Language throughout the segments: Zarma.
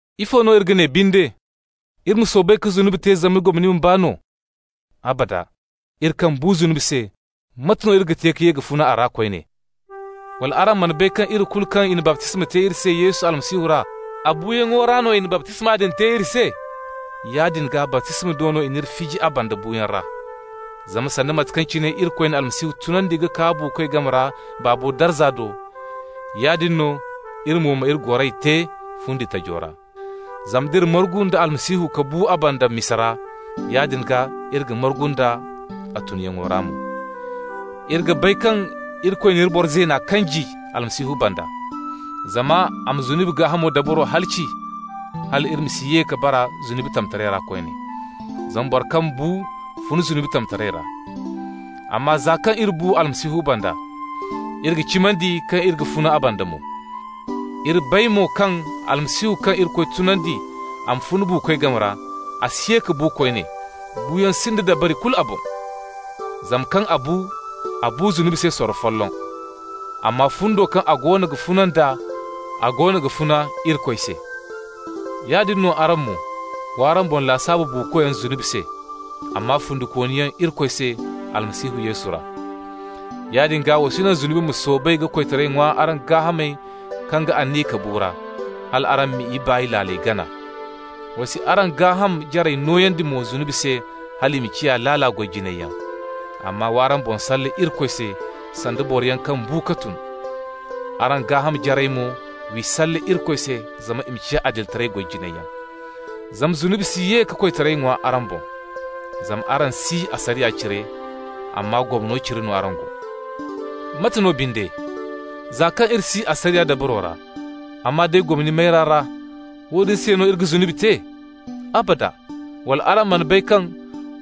Ifo no iri ga ne binde? Iri ma soobay ka zunubi te zama gomni ma baa no? Abada! Iri kaŋ bu zunubi se, mate no iri ga te ka ye ka funa a ra koyne? Wala araŋ mana bay kaŋ iri kulu kaŋ i na baptisma te iri se Yesu Almasihu ra, a buuyaŋo ra no i na baptisma din te iri se? Yaadin gaa, baptisma do no i n'iri fiji a banda buuyaŋ ra. Zama sanda mate kaŋ cine Irikoy na Almasihu tunandi ka kaa buukoy game ra Baabo darza do, yaadin no iri mo ma iri goray te fundi tajo ra. Zama d'iri margu nda Almasihu ka bu a banda misa ra, yaadin gaa iri ga margu nd'a a tunyaŋo ra mo. Iri ga bay kaŋ Irikoy n'iri boro zeena kanji Almasihu banda, zama a ma zunubi gaahamo dabaro halaci, hal iri ma si ye ka bara zunubi tamtaray ra koyne. Zama boro kaŋ bu fun zunubi tamtaray ra. Amma za kaŋ iri bu Almasihu banda, iri ga cimandi kaŋ iri ga funa a banda mo. Iri bay mo kaŋ Almasihu kaŋ Irikoy tunandi a ma fun buukoy game ra, a si ye ka bu koyne, buuyaŋ sinda dabari kulu a boŋ. Zama kaŋ a bu, a bu zunubi se sorro folloŋ. Amma fundo kaŋ a goono ga funa nd'a, a goono g'a funa Irikoy se. Yaadin no araŋ mo: w'araŋ boŋ lasaabu buukoyaŋ zunubi se, amma fundikooniyaŋ Irikoy se Almasihu Yesu ra. Yaadin gaa, wa si naŋ zunubi ma soobay ka koytaray ŋwa araŋ gaahamey kaŋ ga aniya ka bu ra, hal araŋ m'i ibaay laaley gana. Wa si araŋ gaaham jarey nooyandi mo zunubi se hal i ma ciya laala goy jinayyaŋ. Amma w'araŋ boŋ salle Irikoy se, sanda boroyaŋ kaŋ bu ka tun. Araŋ gaaham jarey mo, w'i salle Irikoy se zama i ma ciya adilitaray goy jinayyaŋ. Zama zunubi si ye ka koytaray ŋwa araŋ boŋ, zama araŋ si asariya cire, amma gomno cire no araŋ go. Mate no binde? Za kaŋ iri si asariya dabaro ra, amma day gomni mayra ra, woodin se no iri ga zunubi te? Abada! Wala araŋ mana bay kaŋ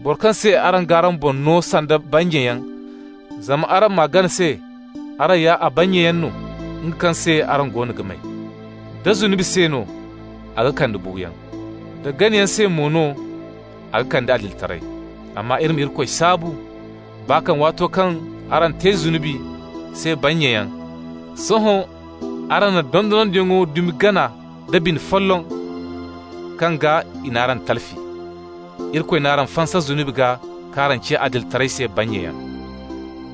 boro kaŋ se araŋ g'araŋ boŋ no sanda bannyayaŋ zama araŋ m'a gana se, araŋ ya a bannyayaŋ no, nga kaŋ se araŋ go no ga may? Da zunubi se no, a ga kande buuyaŋ. Da ganayaŋ se mo no, a ga kande adilitaray. Amma iri ma Irikoy saabu! Baa kaŋ waato araŋ te zunubi se bannyayaŋ, sohõ araŋ na dondonandiyaŋo dumi gana nda bine folloŋ kaŋ gaa i n'araŋ talfi. Irikoy n'araŋ fansa zunubi gaa k'araŋ ciya adilitaray se bannyayaŋ.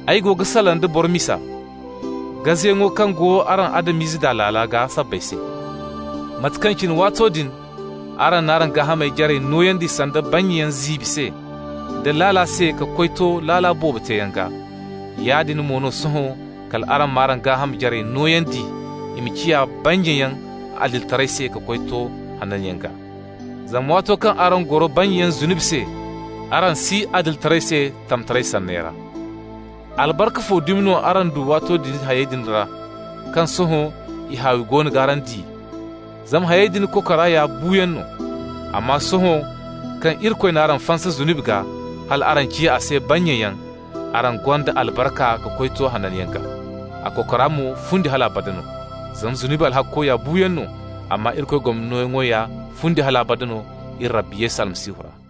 Ay go ga salaŋ da boro misa, gazeyaŋo kaŋ go araŋ Adam-ize daa laala gaa sabbay se. Mate kaŋ cine waato din araŋ n'araŋ gaaham jarey nooyandi sanda bannyayaŋ ziibi se, da laala se ka koy to laala boobo teeyaŋ gaa, yaadin mo no sohõ kal araŋ m'araŋ gaaham jarey nooyandi i ma ciya bannyayaŋ adilitaray se ka koy to hananyaŋ gaa. Zama waato kaŋ araŋ goro bannyayaŋ zunubi se, araŋ si adilitaray se tamtaray sanney ra. Albarka fo dumi no araŋ du waato din hayey din ra kaŋ sohõ i haawi goono g'araŋ di? Zama hayey din kokora ya buuyaŋ no. Amma sohõ kaŋ Irikoy n'araŋ fansa zunubi gaa, hal araŋ ciya a se bannyayaŋ, araŋ gonda araŋ albarka ka koy to hananyaŋ gaa. A kokora mo fundi hal abada no. Zama zunubi alhakko ya buuyaŋ no, amma Irikoy gomni nooyaŋo ya fundi hal abada no, iri Rabbi Almasihu Yesu ra.